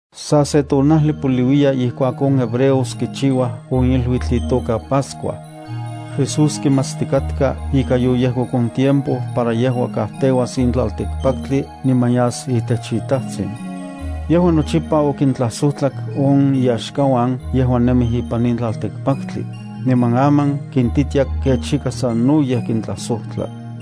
Sa se tonajli poliuiya ijkuak on hebreos kichiuaj on iluitl itoka Pascua. Jesús kimatstikatka ika yoyejkok on tiempo para yejua kajteuas in tlaltikpaktli niman yas itech iTajtsin. Yejua nochipa okintlajsojtlak on iyaxkauan yejuan nemij ipan in tlaltikpaktli, niman aman kintitia kech ika sanoyej kintlajsojtla.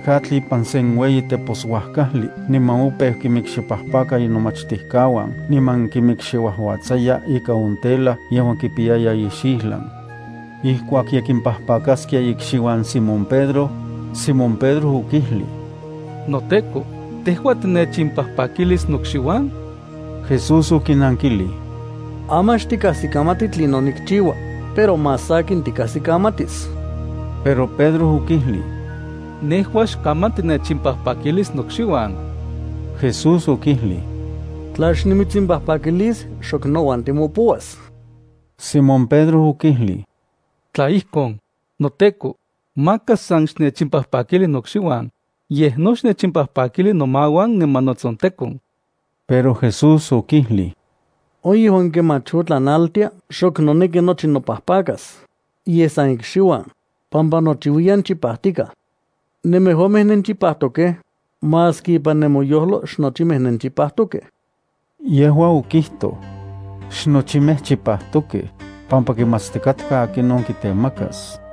Niman kemaj okitekak atl ipan sen ueyi teposuajkajli niman opeu kimikxipajpaka inomachtijkauan niman kimikxiuajuatsaya ikan on tela yejuan kipiyaya ixijlan. Ijkuak ye kimpajpakaskia ikxiuan Simón Pedro, Simón Pedro okijlij: —NoTEKO, ¿tejua tinechimpajpakilis nokxiuan? Jesús okinankilij: —Aman xtikajsikamati tlinon nikchiua, pero más sakin tikajsikamatis. Pero Pedro okijlij: —Nejua xkaman tinechimpajpakilis nokxiuan. Jesús okijlij: —Tla xnimitsimpajpakilis, xok nouan timopouas. Simón Pedro okijlij: —Tla ijkon, noTEKO, maka san xnechimpajpakili nokxiuan, yej no xnechimpajpakili nomauan niman notsontekon. Pero Jesús okijlij: —On yejuan kemach otlan naltia xok noneki nochi nopajpakas, yej san ikxiuan, pampa nochiuiyan chipajtikaj. Nemejuamej nenchipajtokej, maski impan nemoyojlo xnochimej nenchipajtokej. Yejua okijtoj: “Xnochimej chipajtokej”, pampa kimatstikatka akinon kitemakas.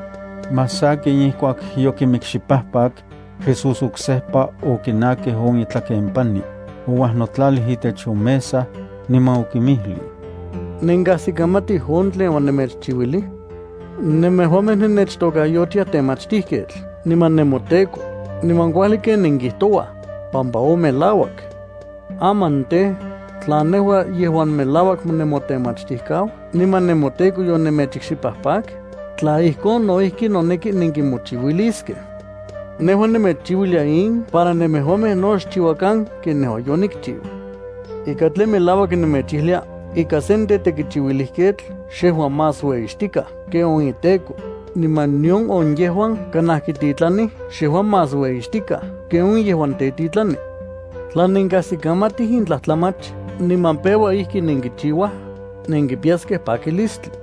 Más sakin ijkuak yokimikxipajpak, Jesús oksejpa okinakij on itlaken pani, ouajnotlalij itech on mesa, niman okinmijlij: —¿Nenkajsikamatij on tlen onemechchiuilij? Nemejuamej nennechtokayotiaj Temachtijketl niman nemoTEKO, niman kuajli ken nenkijtouaj, pampa melauak nejua. Aman tej, tla nejua yejuan melauak nemoTemachtijkau niman nemoTEKO yonemechikxipajpak, tla ijkon, no ijki noneki nenkimochiuiliskej. Nejua nemechchiuilia in para nemejuamej no xchiuakan ken nejua yonikchiu. Ika tlen melauak nemechijlia ika sen tetekichiuilijketl xejua más ueyixtikaj ken on iteko, niman nion on yejuan kanaj kititlanij xejua más ueyixtikaj ken on yejuan tetitlani. Tla nenkajsikamatij in tlajtlamach niman peua ijki nenkichiuaj, nenkipiyaskej pakilistli.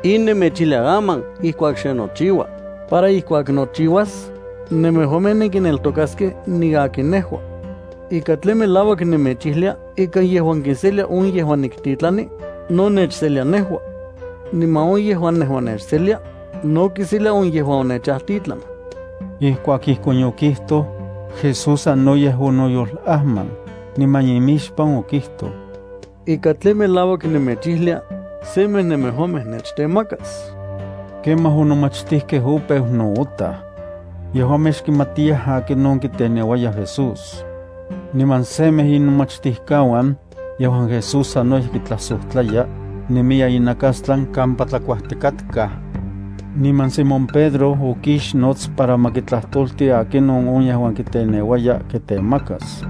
In nemechijlia aman ijkuak xe nochiua, para ijkuak nochiuas, nemejuamej nenkineltokaskej niakin nejua. Ika tlen melauak nemechijlia ika yejuan kiselia on yejuan niktitlani, no nechselia nejua. Niman on yejuan nejua nechselia, no kiselia on yejuan onechajtitlan. Ijkuak ijkon yokijtoj, Jesús sanoyej onoyolajman, niman imixpan okijtoj: —Ika tlen melauak nemechijlia, semej nemejuamej nechtemakas. Kemaj on nomachtijkej opeu nootaj. Yejuamej xkimatiyaj akinon kiteneuaya Jesús. Niman semej inomachtijkauan, yejuan Jesús sanoyej kitlajsojtlaya, nemiya inakastlan kampa tlakuajtikatkaj. Niman Simón Pedro okixnots para ma kitlajtolti akinon on yejuan kiteneuaya kitemakas.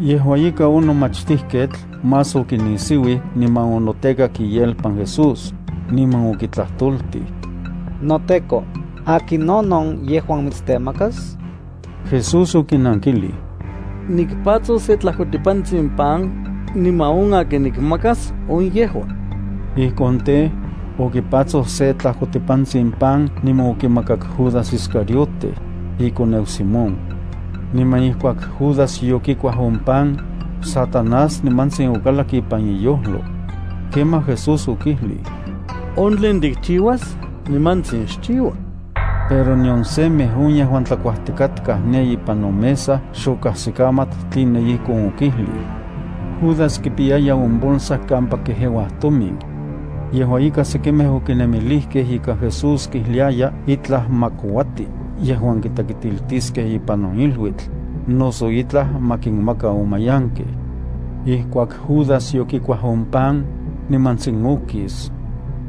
Yejua ika, on nomachtijketl más okinisiuij niman onotekak iyelpan Jesús, niman okitlajtoltij: —NoTEKO, ¿akinon on yejuan mitstemakas? Jesús okinankilij: —Nikpatsos se tlajkotipantsin pan, niman on akin nikmakas, on yejua. Ijkon tej, okipatsoj se tlajkotipantsin pan niman okimakak Judas Iscariote, ikoneu Simón. Niman ijkuak Judas yokikuaj on pan, Satanás nimantsin okalak ipan iyojlo. Kemaj Jesús okijlij: —On tlen tikchiuas, nimantsin xchiua. Pero nion semej on yejuan tlakuajtikatkaj ne ipan on mesa xokajsikamat tline ijkon okijlij. Judas kipiyaya on bolsa kampa kejeuaj tomin. Yejua ika, sekimej okinemilijkej ika Jesús kijliaya itlaj ma kouati yejuan kitekitiltiskej ipan on iluitl, noso itlaj ma kinmaka on mayankej. Ijkuak Judas yokikuaj on pan, nimantsin okis.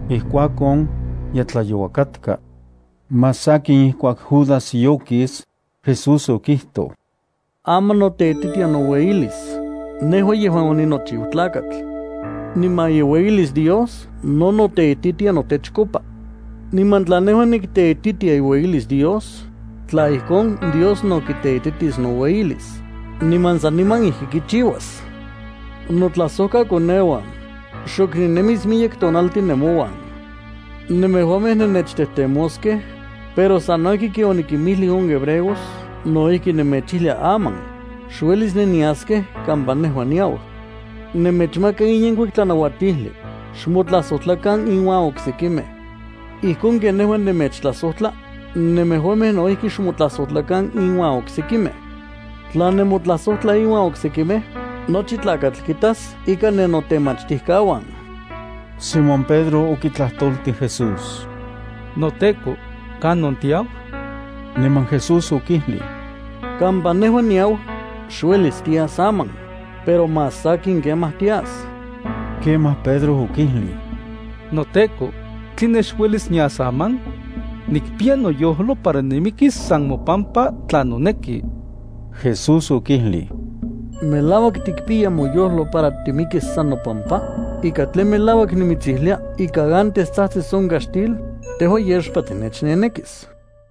Ijkuakon, ye tlayoua katka. Más sakin ijkuak Judas yokis, Jesús okijtoj: —Aman noteititia noueyilis, nejua yejuan oninochiu Tlakatl. Niman iueyilis Dios no noteititia notechkopa. Niman tla nejua nikteititia iueyilis Dios, tla ijkon, Dios no kiteititis noueyilis, niman saniman ijki kichiuas. Notlajsojkakoneuan, xok ninemis miyek tonaltin nemouan. Nemejuamej nennechtejtemoskej, pero sano ijki ken onikimijlij on hebreos no ijki nemechijlia aman: Xuelis nenyaskej kampa nejua niau. Nemechmaka in yenkuik tlanauatijli: xmotlajsojtlakan inuan oksekimej. Ijkon ken nejua nemechtlajsojtla, nemejuamej no ijki xmotlajsojtlakan inuan oksekimej. Tla nemotlajsojtlaj inuan oksekimej, nochi tlakatl kitas ika nennotemachtijkauan. Simón Pedro okitlajtoltij Jesús: —NoTEKO, ¿kanon tiau? Niman Jesús okijlij: —Kampa nejua niau, xuelis tias aman, pero más sakin kemaj tias. Kemaj Pedro okijlij: —NoTEKO, ¿tline xuelis nias aman? Nikpiya noyojlo para nimikis san mopampa tla noneki. Jesús okijlij: —¿Melauak tikpiya moyojlo para timikis san nopampa? Ika tlen melauak nimitsijlia ika antes tsajtsis on kaxtil, tejua yexpa tinechnenekis.